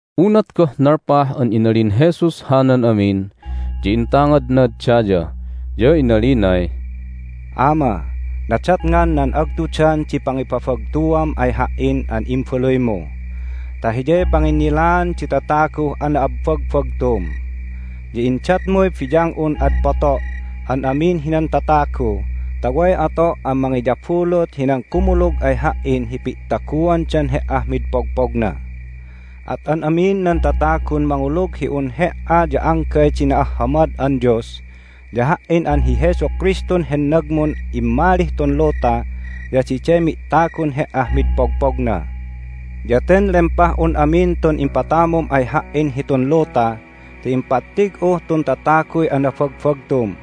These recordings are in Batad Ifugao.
Unat goh nalpah an inalin Jesus hanan amin ya intangadnad daya, ya inalinay, "Ama, nadatngan nan agtudan di pangipabagtuam ay Ha"in an Imbaluymu ta hiyay panginnilaan di tataguh ana'abbagbagtum. Ya indatmuy biyang'un ad poto' an amin hinan tatagu ta way ato' an mangiyabulut hinan kumulug ay Ha"in hi pi'taguandan He"ah mid pogpogna. At an amin nan tatagun mangulug hi un He"a ya anggay di na'ahhamad an Dios ya Ha"in an hi Jesu Kristun hennagmun immalih tun luta ya diday mi'tagun He"ah mid pogpogna. Ya ten lempah'un amin tun impatamum ay Ha"in hitun luta ti impattig'uh tun tataguy anabagbagtum.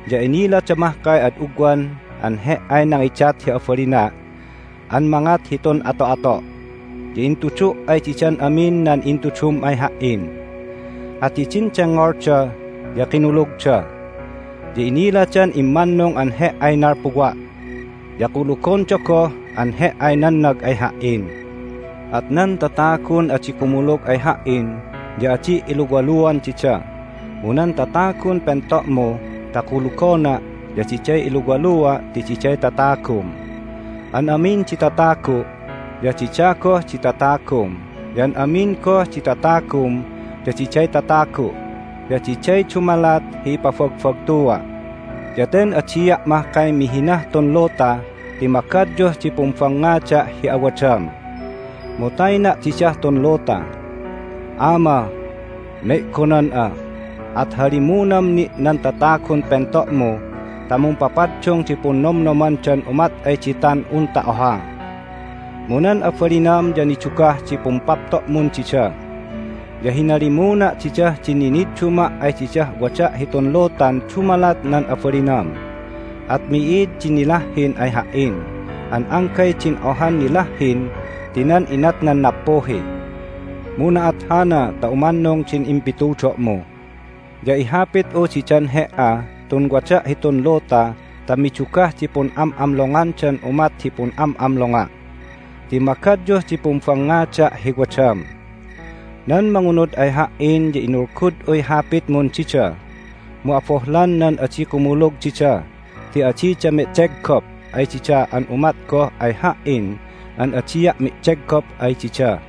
Ya inilada mahkay ad ugwan an He"ay nangidat hi abalina' an mangat hitun ato'ato', ya intudu' ay didan amin nan intudum ay Ha"in. At hidin dengngolda ya kinulugda. Ya iniladan immannung an He"ay nalpuwa', ya kulugonda goh an He"ay nannag ay Ha"in. At nan tatagun adi kumulug ay Ha"in ya adi' iluwaluan dida, mu nan tatagun pento'mu ta kulugona' ya diday iluwalua' ti diday tatagum. An amin di tatagu' ya dida goh di tatagum, ya an amin goh di tatagum ya diday tatagu'. Ya diday dumalat hi ipabagbagtua'. Ya ten adia' mahkay mihinah tun luta ti magadyuh di pumbangngada' hi awadam, mu tayna' didah tun luta. Ama, me'gonan'a, at halimunam ni' nan tatagun pento'mu ta mumpapaddung di punnomnomandan umat ay ditan unta oha. Mu nan abalinam ya nidugah di pumpapto'mun dida. Ya hinalimuna' didah din ninidduma' ay didah wada' hitun lutan dumalat nan abalinam, at mi'id di nilahhin ay Ha"in an anggay din ohan nilahhin ti nan inatnan nappuhi. Mu na'at hana ta umannung din impitudo'mu. Ya ihapit'u didan He"ah tun wada' hitun luta ta midugah di pun'am'amlongandan umat hi pun'am'amlonga', ti magadyuh di pumbangngada' hi wadam. Nan mangunud ay Ha"in ya inulgud'uy Hapitmun dida, mu abohlan nan adi kumulug dida ti adida medeggop ay dida an umat goh ay Ha"in an adia' medeggop ay dida.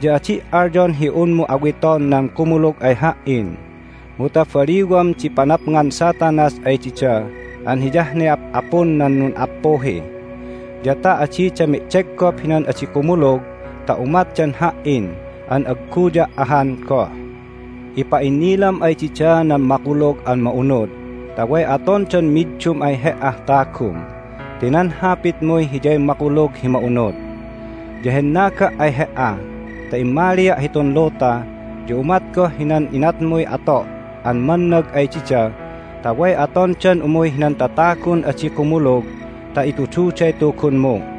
Ya adi' alyon hi unmu awiton nan kumulug ay Ha"in, mu ta baliwam di panapngan Satanas ay dida an hiyah ne ap'apun nan nun'appuhi. Ya ta adida medeggop hinan adi kumulug ta umatdan Ha"in an agguya' ahan goh. Ipa'innilam ay dida nan Makulug an Ma'unud ta way atondan middum ay He"ah tagum, ti nan Hapitmuy hiyay Makulug hi Ma'unud. Ya hennaga' ay He"a ta immalia' hitun luta, ya umat goh hinan inatmuy ato' an mannag ay dida ta way atondan umuy hinan tatagun adi kumulug ta itududay Tugunmu.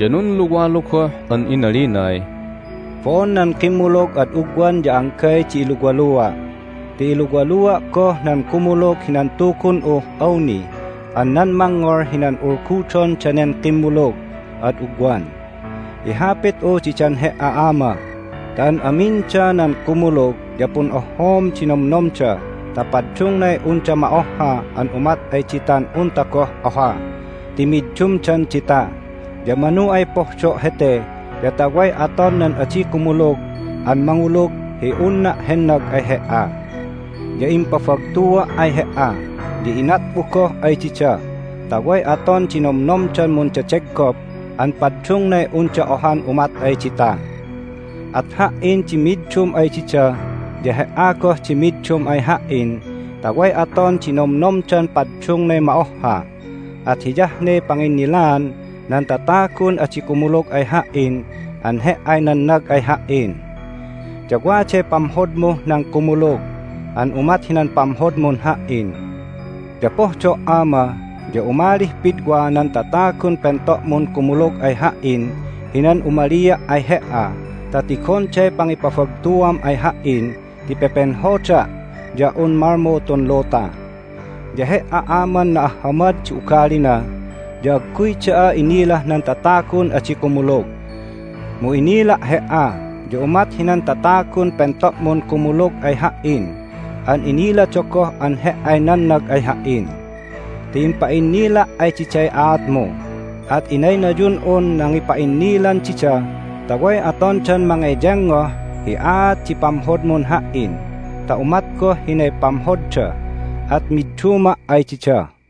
Ya nunluwalu goh an inalinay, "Bo'on nan kimmulug ad ugwan ya anggay di iluwalua', ti iluwalua' goh nan kumulug hinan Tugun'uh awni an nan mangngol hinan ulgudon danen kimmulug ad ugwan. Ihapit'u didan He"a, Ama, ta an aminda nan kumulug ya pun'ohhoom di nomnomda ta paddungnay unda ma'ohha an umat ay ditan unta goh oha ti middumdan dita. Ya manu ay pohdo' hete ya ta way aton nan adi kumulug an mangulug hi unna' hennag ay He"a. Ya impabagtua' ay He"a, ya inat'u goh ay dida ta way aton di nomnomdan mundedeggop an paddungnay unda ohan umat ay dita. At Ha"in di middum ay dida, ya He"a goh di middum ay Ha"in ta way aton di nomnomdan paddungnay ma'ohha, at hiyah ne panginnilaan nan tatagun adi kumulug ay Ha"in an He"ay nannag ay Ha"in, ya waday pamhodmuh nan kumulug an umat hinan pamhodmun Ha"in. Ya pohdo', Ama, ya umalih pidwa nan tatagun pento'mun kumulug ay Ha"in hinan umalia' ay He"a ta tigonday pangipabagtuam ay Ha"in ti pepenhoda' ya un malmu tun luta. Ya He"a, Aman na'ahhamad di ugalina, ya agguy da'a inilah nan tatagun adi kumulug! Mu inila' He"a ya umat hinan tatagun pento'mun kumulug ay Ha"in an inilada goh an He"ay nannag ay Ha"in. Ti impa'innila' ay diday aatmu, at inaynayun'un nangipa'innilan dida ta way atondan mangeyengngoh hi aat di pamhodmun Ha"in ta umat goh hinay pamhodda, at midduma' ay dida."